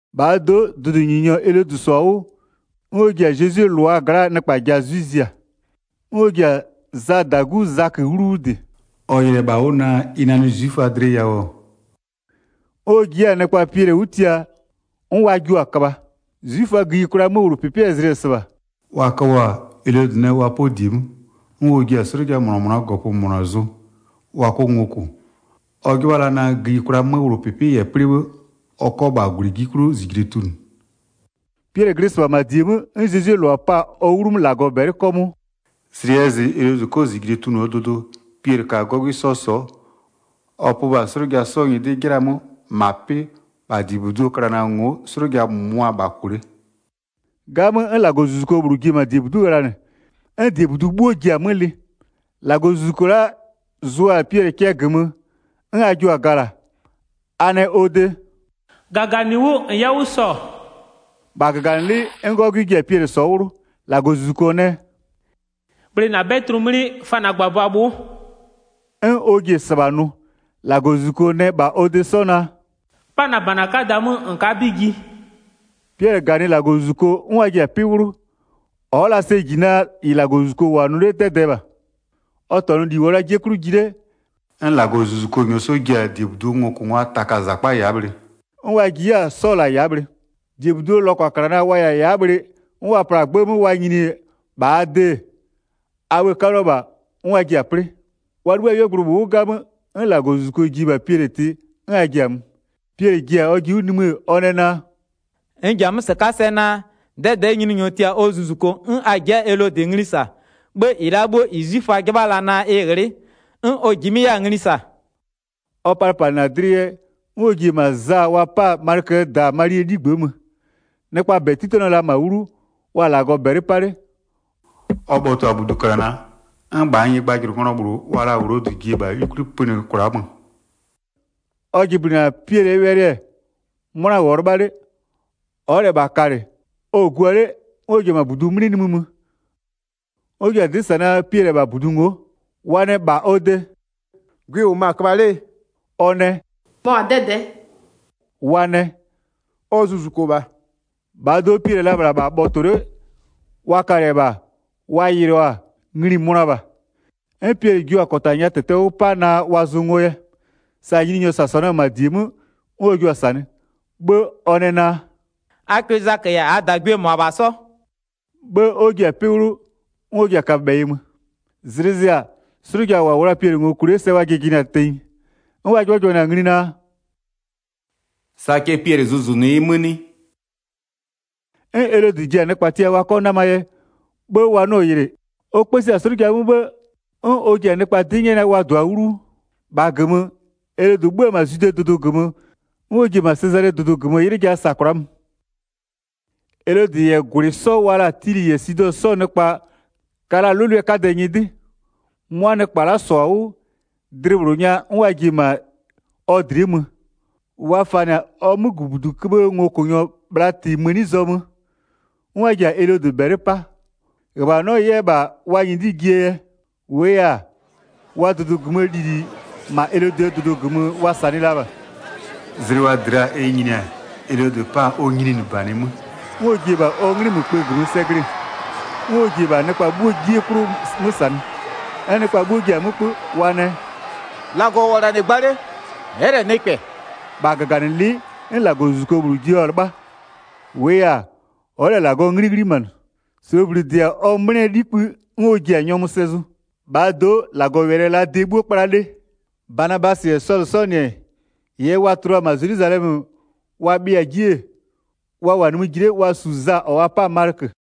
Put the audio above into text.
1-Bhaa do'o, dʋdʋnyininyɔ Elodɩ -sɔ-a 'wʋ, 'n ɔ ji-a Zezwie -lʋa gla'aa nɩkpa ja 'zwɩ zia. 'N ɔ ji-a Zaa -dagu Zakö 'wlu 'wʋ -dɩ. Ɔ yɩlɩ-ɛ -bha 'wʋ naa ɩ nanɩ 'zwiföa dlɩ yawʋ-ɔ, 'n ɔ ji 'yɛ-a nɩkpa Piɛlɩ 'wʋ tia 'n wa jio-a köbha. 'Zwiföaa gïyikwlaa 'möwlʋpɩpɩɛ zlɩ-ɛ -sɩbha. Wa köbhɔ-a, Elodɩ nɛ wa 'pɔ -die 'mö, 'n ɔ ji-a 'slʋja -mʋna -mʋnaa -gɔpö -mʋna zʋ, wa 'kɔ ngo -kʋ. Ɔ 'jɩbha la naa gïyikwlaa 'möwlʋpɩpɩ -yɛ 'plɩ 'bhë, ɔ 'kɔ -bha -gwlɩ 'ji 'klʋ -zijle tunʋ. Piɛlɩ glɩ -sɩbha -ma -die 'mö n Zezwie -lʋa pa-a ɔ 'wlumö -Lagɔ -bɛlɩ 'kɔmʋʋ. Zlɩ 'yɛ zɩ Elodɩ 'kɔ -zijle tunʋɔ dʋdʋ, Piɛlɩ ka 'gɔgwɩ 'sɔ sɔ'ɔ, ɔ pö -bha 'slʋja 'sɔɔ nyɩdɩ 'jɩla 'mö, -ma 'pɩ, -bha -diebuduo klana ngo'o 'slʋja -mʋmʋa-a -bha -kʋ 'le. 'Gamö, 'n -Lagɔzuzuko -bhlʋ ji-e -ma -diebudu'u ghlanɩ, 'n -diebudu 'bhuo 'mö ji-a lɩ. -Lagɔzuzuko la'a zʋ-a Piɛlɩ cɛ -gömö, 'n a jio-a gala, a nɛ -bha ɔ de: “-Gaganɩ 'wʋ -n 'yɛ 'wʋ -sɔ.” -Bha -gaganɩlɩ'ɩ, 'n 'gɔgwɩ ji-a Piɛlɩ sɔ'ɔ 'wlʋ. 8-Lagɔzuzuko nɛ: “Bhlɩ -na 'bɛdlʋ 'mlɩ, fa -na -gbabʋa bhʋ'ʋ.” 'N ɔ ji-e -sɩbha nʋ. -Lagɔzuzuko nɛ 'yɛ -bha ɔ de 'sɔ naa: “'Pa -na -bana 'kada 'mö -n ka'a 'bɩ ji.” Piɛlɩ -ganɩ -Lagɔzuzuko 'n wa ji-a 'pɩ 'wlʋ. Ɔ'ɔ la sɛ -ji naa -ɩ -Lagɔzuzuko -wʋ-a nʋ 'le 'dɛdɛɛ -bha, ɔ -tɔnʋ -li -wʋɔ la 'jie 'klʋ ji 'le. 'N -Lagɔzuzuko -nyɔɔ 'sɔ ji-a -diebuduo ngokʋngwaa taka -zakpa ya'a bhlɩ, 'n wa ji 'yɛ-a 'sɔ -la ya'a bhlɩ. -Diebuduo lɔkwaklana wa -yɛ-a ya'a bhlɩ 'n wa pla-a 'gbë 'mö wa nyini-e -bha a de, a bhë-ë 'kaluo -bha 'n wa ji-a 'plɩ. Wa 'libhï-a 'yuogblʋ -bhlʋ 'wʋ 'gamö, 'n -Lagɔzuzuko ji-e -bha Piɛlɩ tɩ 'n a ji-a mö. Piɛlɩ ji-a ɔjɩ 'wʋ nimï-ë, ɔ nɛ naa: “N ji-a 'mö -sɩka'a sɛ naa, 'dɛdɛ'ɛ Nyininyɔ tia-a ɔ zuzuko 'n a ji'i-a Elodɩ ngli -sa, 'bhë -ɩ la'a 'bhuo -ɩ 'zwiföa 'jɩbha la-a naa ɩ ghlɩ'ɩ, 'n ɔ -jimɩ'ɩ 'yɛ-a ngli -sa.” Ɔ palɩpalɩnɩ-a dlɩ yɛ, 'n ɔ ji-e -ma Za wa 'pa-a Malɩköö -da Malie 'ligbë'ë mö. Nɩkpaa -bɛ 'titanɩɔ la -ma 'wlu, wa-a -Lagɔ -bɛlɩ 'pa 'le. Ɔ bhɔtɔ-a -buduklana, 'n -bhaa nyɩgbajʋlʋnglɔ -bhlʋ wa la-a Wlodɩ ji-e -bha 'yukwli -pönɩ kwla'a mö. Ɔ jɩblɩnɩ-a Piɛlɩɛ wɛlɩ, 'mʋna -wʋɔ 'lɩbha 'le, ɔ'ɔ -lɛ -bha kalɩ, ɔ-ɔ gua 'le, 'n ɔ ji-e -ma -budu 'mlɩ nimï mö, 'n ɔ ji-a 'dɩ -sa naa Piɛlɩ-ɛ -bha -budu ngo'o. Wa nɛ -bha ɔ de: “Gwɩ-ɩ -wʋmö-a köbha 'lee?” Ɔ nɛ: “Mɔ-a 'dɛdɛ'ɛ.” Wa nɛ: “Ɔ zuzuko -bha.” 16-Bhaa do'o, Piɛlɩ-ɛ la -bhla -bha bhɔtɔ 'le, wa kalɩ-ɛ -bha, wa yɩlɩɔ-a, ngli-i mönʋa -bha. 'N Piɛlɩ jua-a -kɔta nya -tɛtɛ 'wʋ pa naa wa zʋ ngo yɛ. Sa Nyininyɔ -sasanɩɔ-ɔ -ma -die 'mö 'n ɔ jua-a -sanɩ. 'Bhë ɔ nɛ naa: “A kwɩ Zakö -yɛ -aa -dagwie -mʋabha 'sɔ.” 'Bhë 'n ɔ ji-a 'pɩ 'wlʋ, 'n ɔ ji-a kaböbhɛyɩ mö. Zlɩ zɩ-a, 'slʋja -wa -wʋ la-a Piɛlɩ ngo -kʋ 'le sɛ wa jɩjɩnɩ-a tenyi. 'N wa 'jɩbhajɩbhanɩ-a ngli naa: “Sa cɛ Piɛlɩ zʋzʋnʋ yɩ 'mö 'nɩ?” 'N Elodɩ ji-a nɩkpa tia wa 'kɔ 'namaa yɛ, 'bhë wa 'nɩɔ-ɔ yɩlɩ, ɔ 'kpësi-a 'slʋja 'mö 'bhë 'n ɔ ji-a nɩkpa 'dɩ 'nyɛ naa wa -dʋa 'wlu 'wʋ. -Bha -gömö, Elodɩ 'bhö-ö -ma Zwidee dʋdʋ -gömö, 'n ɔ ji-e -ma Sezalee dʋdʋ -gömö 'ylɩ ja -sa kwla'a mö. Elodɩ -yɛ -gwlɩ 'sɔ wa laa Tilɩ -yɛ Sidɔ 'sɔɔ nɩkpa ka la-a 'lʋlʋɛ 'kadɛ nyɩdɩ. 'Mʋa nɩkpa la'a -sɔ-a 'wʋ, dlɩ -bhlʋ nya 'n wa ji-e -ma ɔ dlɩ'ɩ mö. Wa fanɩ-a ɔ 'mögʋbuduköbhëë ngokʋnyɔ Blatɩ mëni zɔmö, 'n wa ji-a Elodɩ -bɛlɩ 'pa, -ghöbhanɔ 'yɛ -bha wa nyɩdɩ jie yɛ. -Wʋʋ yɛ-a, wa dʋdʋ -gömöö lili -ma Elodɩɛ dʋdʋ -gömö wa -sanɩɩ la -bha. Zlɩ wa -dɩ la-a ɛ nyini-a, Elodɩ 'pa-a ɔ nyininɩbanɩ 'mö, 'n ɔ ji-e -bha 'nglɩmökpë -gömö sɛ glɩ-ɩ, 'n ɔ ji-e -bha nɩkpa 'bhuo 'jie 'klʋ 'mö -sanɩ. 'N nɩkpa 'bhuo ji-a mö 'kpö, wa nɛ: “-Lagɔ -wʋ-ɔ -la -nɩ gba 'le, ɛ'ɛ -lɛ nɩkpɛ.” 23-Bha -gaganɩlɩ'ɩ 'n -Lagɔzuzuko -bhlʋ jio-a 'lɩbha. -Wʋʋ yɛ-a, ɔ'ɔ -lɛ -Lagɔɔ 'nglɩ 'ghlimanɩ. -Sloobli -dɩ-a ɔ 'mlɩɛ 'likpë 'n ɔ ji-a nyɔmʋ sɛ zʋ. 24-Bhaa do'o, -Lagɔwɛlɩ-ɛ la de 'bhuo 'kpla 'le. Banabasɩ -yɛ Sɔlʋ 'sɔɔ -nɩ-ɛ, -ɩɩ yɛ wa tua la-a -ma Zelwizalɛmö wa bhɩɩa-a 'ji-e, wa -wʋ-a nimï ji 'le wa -su Za -ɔ wa 'pa-a Malɩkö.